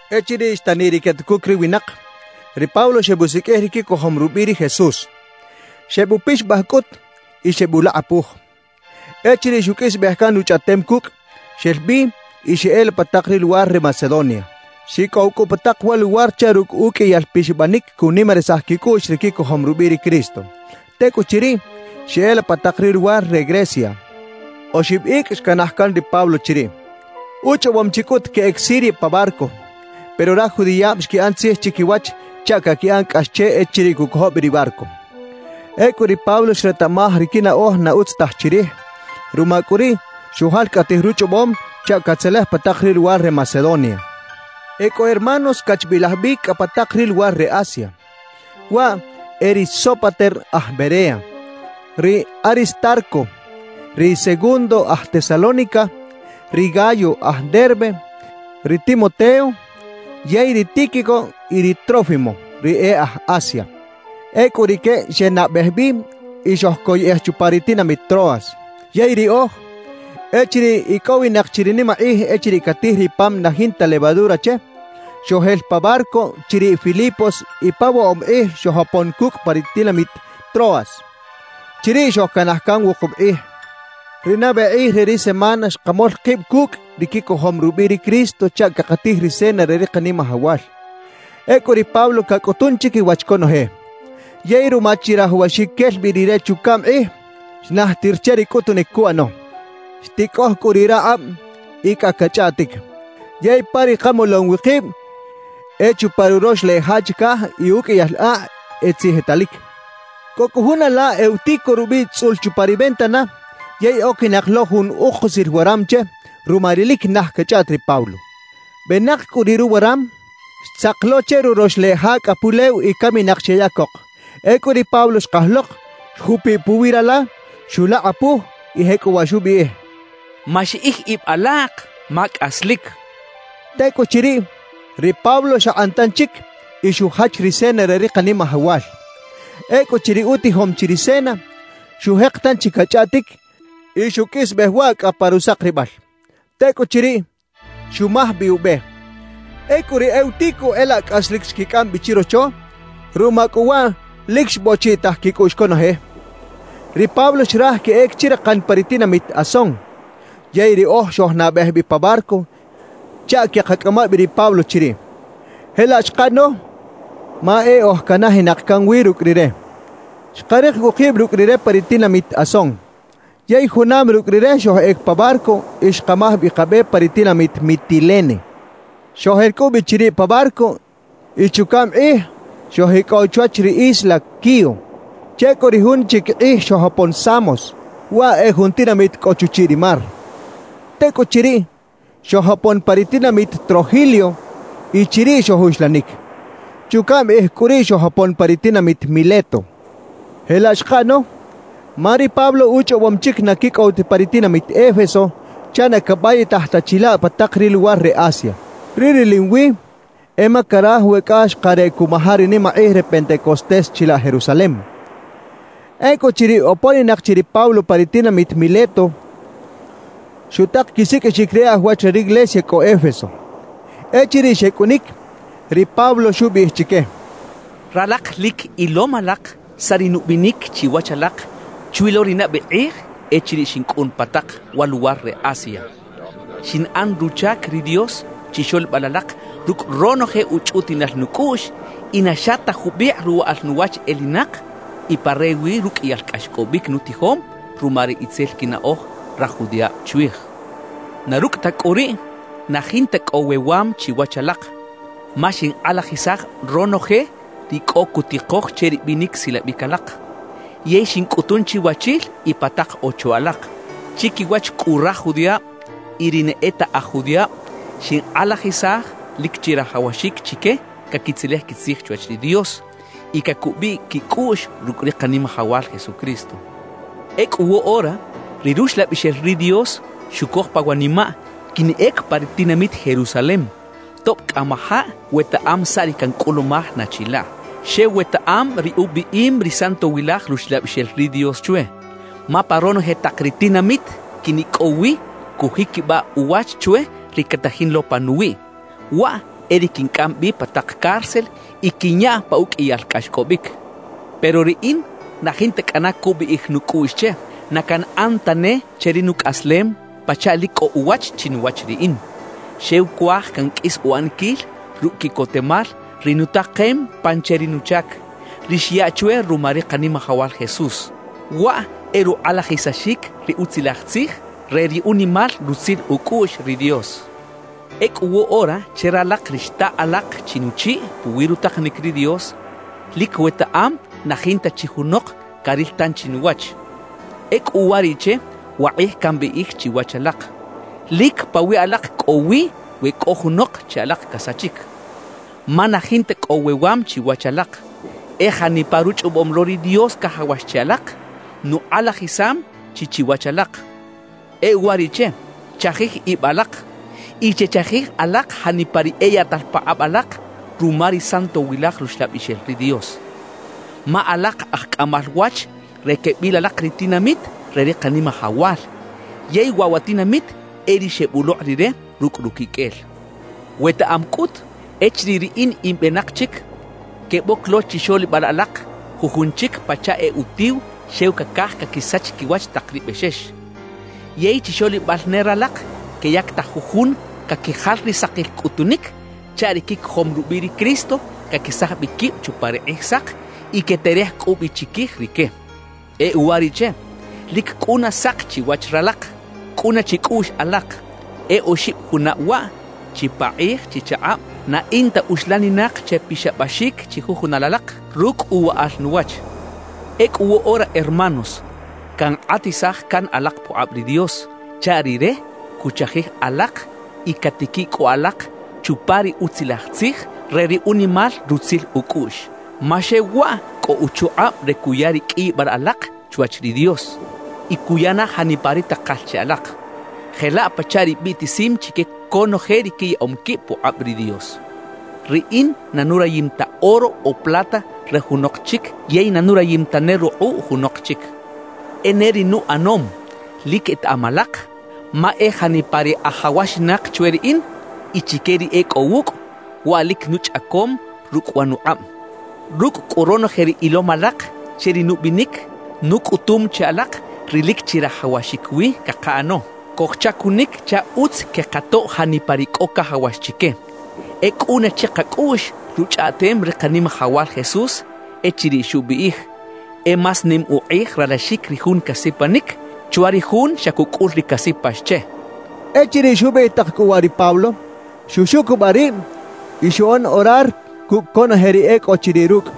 Echiriꞌ xtaniꞌ ri quetucuc ri winak, ri Pablo xebusiqꞌuij ri quicojom rubiꞌ ri Jesús. Xebupixabaj cꞌut y xebulakꞌapuj. Echiriꞌ xuqꞌuisbej can uchꞌaꞌtem cucꞌ, xel bi y xeꞌela pa tak ri luwar re Macedonia. Xicꞌow cꞌu pa tak wa luwar chaꞌ rucꞌ uqꞌuiyal pixabanic cunimarisaj quicꞌuꞌx ri quicojom rubiꞌ ri Cristo. Tecꞌuchiriꞌ, xeꞌela pa tak ri luwar re Grecia. Oxib icꞌ xcanaj can ri Pablo chiriꞌ. Uchꞌobom chi cꞌut queꞌec Siria pa barco; pero raj judiꞌab xquiꞌan tzij chiquiwach chaꞌ caquiꞌan cꞌax che echiriꞌ cuꞌcojo bi ri barco. Ecꞌu ri Pablo xretaꞌmaj ri quinaꞌoj na utz taj chirij; ruma cꞌu riꞌ, xujalcꞌatij ruchꞌobom chaꞌ catzelej pa tak ri luwar re Macedonia. E cꞌo hermanos xcachbilaj bi cꞌa pa tak ri luwar re Asia. Waꞌ e: ri Sópater aj Berea, ri Aristarco, ri Segundo aj Tesalónica, ri Gayo aj Derbe, ri Timoteo, yey ri Tíquico y ri Trófimo, ri e aj Asia. Ecꞌu rique xenabej bi y xojcoyꞌej chupa ri tinamit Troas. Yey riꞌoj, echiriꞌ icꞌowinak chi ri nimakꞌij echiriꞌ catij ri pam na jinta levadura che, xojel pa barco chiriꞌ Filipos y pa woꞌob kꞌij xojopon cucꞌ pa ri tinamit Troas. Chiriꞌ xojcanaj can wukub kꞌij. Ri nabe kꞌij re ri semana xkamol kib cucꞌ ri quicojom rubiꞌ ri Cristo chaꞌ cakatij ri cena re ri Kanimajawal. Ecꞌu ri Pablo cacꞌutun chiquiwach conoje. Yey ruma chirajawaxic quel bi rire chucaꞌm kꞌij, xnajtir che ri cꞌutunic cuꞌano. Xticꞌoj cꞌu riꞌ rakꞌab y cꞌa cachꞌaꞌtic. Yey pa ri kamolom wi kib e chupa ruroxleꞌ ja chicaj y uqꞌuiyal akꞌ e tzijitalic. Cꞌo cꞌu jun ala Eutico rubiꞌ tzꞌul chupa ri ventana yey oquinak lo jun ukusil waram che ruma ri lic naj cachꞌaꞌt ri Pablo. Benak cꞌu riꞌ ruwaram, xtzak lo che churox leꞌ ja cꞌa pulew y caminak xeꞌyacok. Ecꞌu ri Pablo xkaj lok, xjupiꞌ puwi rala, xulakꞌapuj y jecꞌuwaꞌ xubiꞌij: «Maxiꞌij ib alak, ma cꞌaslic» xchaꞌ. Tecꞌuchiriꞌ, ri Pablo xakꞌan tanchic y xujach ri cena re ri Kanimajawal. Ecꞌuchiriꞌ utijom chi ri cena, xujek tanchi cachꞌaꞌtic y xuqꞌuisbej waꞌ cꞌa pa rusakribal. Tecꞌuchiriꞌ, xumaj bi ube. Ecꞌu ri Eutico e laꞌ cꞌaslic xquicꞌam bi chirocho; ruma cꞌu waꞌ lic xbochiꞌitaj quicꞌuꞌx conoje. Ri Pablo xraj queꞌec chirakan pa ri tinamit Asón. Yey riꞌoj xojnabej bi pa barco chaꞌ queꞌkacꞌama bi ri Pablo chiriꞌ. Jelaꞌ xkaꞌano ma e oj canajinak can wi rucꞌ rire. Xkarik cꞌu kib rucꞌ rire pa ri tinamit Asón. Yey junam rucꞌ rire xojꞌec pa barco y xkamaj bi kabe pa ri tinamit Mitilene. Xojel cꞌu bi chiriꞌ pa barco y chucaꞌm kꞌij xojicꞌow chwach ri isla Quío. Che cꞌu ri jun chic kꞌij xojopon Samos, waꞌ e jun tinamit cꞌo chuchiꞌ ri mar. Tecꞌuchiriꞌ, xojopon pa ri tinamit Trogilio y chiriꞌ xojuxlanic. Chucaꞌm kꞌij cꞌu riꞌ xojopon pa ri tinamit Mileto. Jelaꞌ xkaꞌano, ma ri Pablo uchꞌobom chic na quicꞌow ta pa ri tinamit Éfeso chaꞌ na cabayitaj ta chilaꞌ pa tak ri luwar re Asia. Ri rilim wi e ma caraj we cꞌa xakareꞌ cuꞌmaja ri nimakꞌij re Pentecostés chilaꞌ Jerusalem. Ecꞌuchiriꞌ oponinak chi ri Pablo pa ri tinamit Mileto, xutak quisiqꞌuixic ri e aj wach re riglesia cꞌo Éfeso. Echiriꞌ xecꞌunic, ri Pablo xubiꞌij chique: «Ralak lic ilom alak saꞌ ri nubinic chiwach alak chwi lo ri nabe kꞌij echiriꞌ xincꞌun pa tak wa luwar re Asia. Xinꞌan ruchac ri Dios chixoꞌlibal alak rucꞌ ronoje uchꞌutiꞌnal nucꞌuꞌx y na xa ta jubikꞌ ruwaꞌal nuwach elinak y pa rewi ruqꞌuiyal cꞌaxcꞌobic nutijom ruma ri itzel quinaꞌoj raj judiꞌab chwij. Na rucꞌ ta cꞌu riꞌ, na jinta cꞌo wewam chiwach alak, ma xinkꞌalajisaj ronoje ri cꞌo cutikoj che ri binic silabic alak, yey xincꞌutun chiwachil y pa tak ocho alak. Chiquiwach cꞌu raj judiꞌab y ri na e ta aj judiꞌab, xinkꞌalajisaj lic chirajawaxic chique caquitzelej quitzij chwach ri Dios y cacubiꞌ quicꞌuꞌx rucꞌ ri Kanimajawal Jesucristo. »Ecꞌu woꞌora, ri Ruxlabixel ri Dios xucoj pa wanimaꞌ quinꞌec pa ri tinamit Jerusalem tob cꞌamajaꞌ wetaꞌam saꞌ ri cancꞌulumaj na chilaꞌ; xew wetaꞌam ri ubiꞌim ri Santowilaj Ruxlabixel ri Dios chwe. Ma pa ronoje tak ri tinamit quinicꞌow wi, cujiquibaꞌ uwach chwe ri catajin lo panuwiꞌ; waꞌ e ri quincꞌam bi pa tak cárcel y quinyaꞌ pa uqꞌuiyal cꞌaxcꞌobic. Pero riꞌin na jinta cꞌana cubiꞌij nucꞌuꞌx che, na canꞌan tane che ri nucꞌaslem pachaꞌ lic cꞌo uwach chinuwach riꞌin; xew cuaj canqꞌuis uꞌaniquil rucꞌ quiꞌcotemal ri nutakem pan che ri nuchac, ri xyaꞌ chwe ruma ri Kanimajawal Jesús. Waꞌ e rukꞌalajisaxic ri Utzilaj Tzij re ri unimal rutzil ucꞌuꞌx ri Dios. »Ecꞌu woꞌora che ralak ri xtaꞌ alak chi nuchiꞌ puwi rutakanic ri Dios, lic wetaꞌam na jinta chi junok caril tanchi nuwach. Ecꞌu uwariꞌche wakꞌij cambiꞌij chiwach alak: Lic pawiꞌ alak cꞌo wi we cꞌo junok che alak casachic. Ma na jinta cꞌo wewam chiwach alak; e janipa ruchꞌobom lo ri Dios cajawax che alak, nukꞌalajisam chi chiwach alak. »E uwariꞌche, chajij ib alak y chechajij alak janipa ri eyaꞌtal pakꞌab alak ruma ri Santowilaj Ruxlabixel ri Dios. Ma alak aj cꞌamal wach re quebil alak ri tinamit re ri Kanimajawal, yey waꞌ wa tinamit e ri xebulokꞌ Rire rucꞌ ruquiqꞌuel. Wetaꞌam cꞌut echiriꞌ riꞌin in benak chic, queboc lo chixoꞌlibal alak jujun chic pachaꞌ e utiw xew cacaj caquisach quiwach tak ri bexex. Yey chixoꞌlibal ne ralak queyactaj jujun caquijal ri sakil cꞌutunic chaꞌ ri quicojom rubiꞌ ri Cristo caquesaj bi quib chupa ri Kꞌijsak y queterej cꞌu bi chiquij rique. E uwariꞌche, lic cꞌuna sak chiwach ralak. Cꞌuna chicꞌuꞌx alak: E oxib junab waꞌ, chipakꞌij chichakꞌab, na in ta uxlaninak che pixabaxic chijujunal alak rucꞌ uwaꞌal nuwach. »Ecꞌu woꞌora hermanos, cankꞌatisaj can alak pukꞌab ri Dios chaꞌ Rire cuchajij alak y catiquiꞌ cꞌu alak chupa ri Utzilaj Tzij re ri unimal rutzil ucꞌuꞌx. Ma xew waꞌ cꞌo uchukꞌab re cuya ri qꞌuiyibal alak chwach ri Dios y cuya na janipa ri takal che alak, jelaꞌ pachaꞌ ri biꞌtisim chique conoje ri quiyaꞌom quib pukꞌab ri Dios. »Riꞌin na nurayim ta oro o plata re junok chic yey na nurayim tane rukꞌuꞌ junok chic. E ne ri nuꞌanom, lic etaꞌam alak; ma e janipa ri ajawaxinak chwe riꞌin y chique ri e cꞌo wucꞌ, waꞌ lic nuchꞌacom rucꞌ wa nukꞌab. Rucꞌ cꞌu ronoje ri ilom alak che ri nubinic, nucꞌutum che alak ri lic chirajawaxic wi cakaꞌano: Cojchacunic chaꞌ utz quekatoꞌ janipa ri cꞌo cajawax chique. E cꞌuna chikacꞌuꞌx ruchꞌaꞌtem ri Kanimajawal Jesús echiriꞌ xubiꞌij: “E más nim ukꞌij ralaxic ri jun casipanic, chwa ri jun xa cucꞌul ri casipax che”» xchaꞌ. Echiriꞌ xubiꞌij tak cꞌu waꞌ ri Pablo, xuxucubaꞌ rib y xuꞌan orar cucꞌ conoje ri e cꞌo chiriꞌ rucꞌ.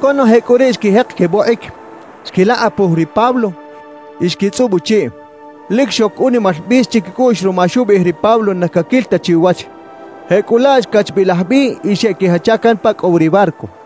Conoje cꞌu riꞌ xquijek quebokꞌic, xquilakꞌapuj ri Pablo y xquitzꞌub uchiꞌ. Lic xoc unimal bis chiquicꞌuꞌx ruma xubiꞌij ri Pablo na caquil ta chi uwach. Jecꞌulaꞌ xcachbilaj bi y xeꞌquijacha can pa cꞌo wi ri barco.